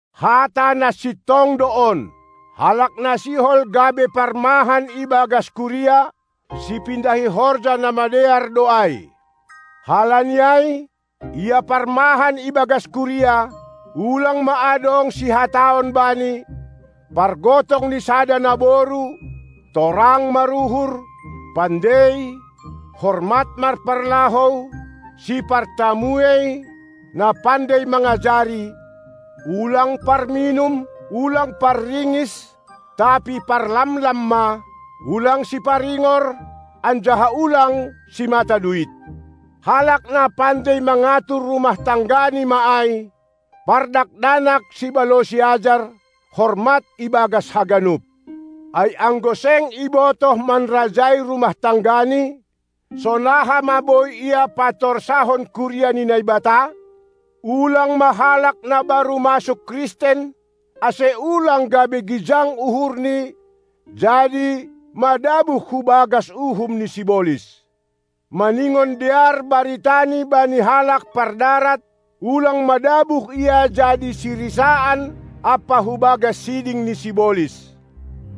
Hata na sintong do on: Halak na sihol gabe parmahan ibagas kuria, sipindahi horja na madear do ai. Halani ai, ia parmahan ibagas kuria, ulang ma adong sihataon bani, pargotong ni sada naboru, torang maruhur, pandei, hormat marparlahou, sipartamuei, na pandei mangajari, ulang parminum, ulang parringis tapi parlamlam ma; ulang siparingor, anjaha ulang simata duit. Halak na pandei mangatur rumah tanggani ma ai, pardakdanak sibalosi ajar, hormat ibagas haganup. Ai anggo seng ibotoh manrajai rumah tanggani, sonaha ma boi ia patorsahon kuria ni Naibata? Ulang ma halak na baru masuk Kristen, ase ulang gabe gijang uhurni jadi madabuh hu bagas uhum ni sibolis. Maningon dear baritani bani halak pardarat, ulang madabuh ia jadi sirisaan ampa hubagas siding ni sibolis.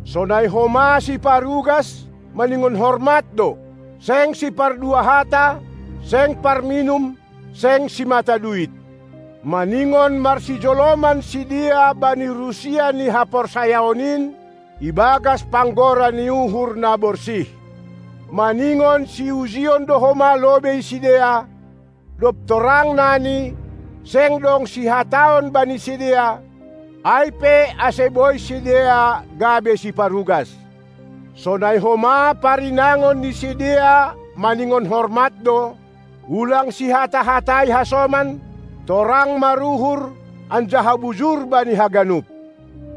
Sonai homa siparugas maningon hormat do, seng sipardua hata, seng parminum, seng simata duit. Maningon marsijoloman sidea bani rusia ni haporsayaon in ibagas panggora ni uhur na borsih. Maningon siujion do homa lobei sidea; dob torang nani, seng dong sihataon bani sidea, ai pe ase boi sidea gabe siparugas. Sonai homa parinangon ni sidea maningon hormat do, ulang sihata-hatai hasoman, torang maruhur anjaha bujur bani haganup.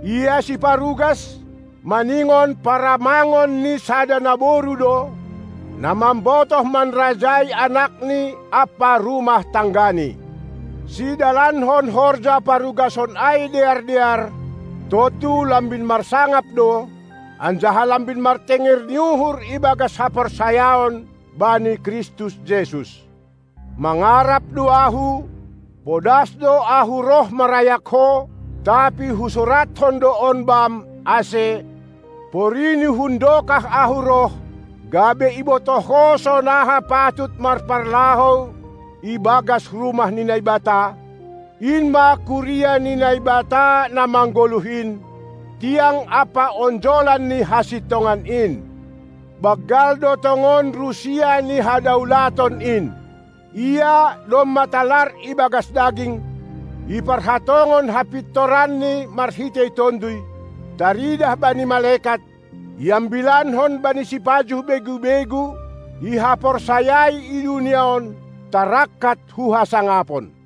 Ia siparugas, maningon paramangon ni sada naboru do, na mambotoh manrajai anakni ampa rumah tanggani. Sidalankon horja parugason ai dear-dear, tontu lambin marsangap do, anjaha lambin martenger ni uhur ibagas haporsayaon bani Kristus Jesus. Mangarap do ahu, podas do ahu roh marayak ho, tapi husurathon do on bam, ase, porini hun dokah ahu roh, gabe ibotoh ho sonaha patut marparlahou ibagas rumah ni Naibata, in ma kuria ni Naibata na manggoluh in, tiang ampa onjolan ni hasintongan in. Banggal do tongon rusia ni hadaulaton in: Ia domma talar ibagas daging, iparhatongon hapintoranNi marhitei Tonduy, taridah bani malekat, iambilankon bani sipajuh begu-begu, ihaporsayai i dunia on, tarangkat hu hasangapon.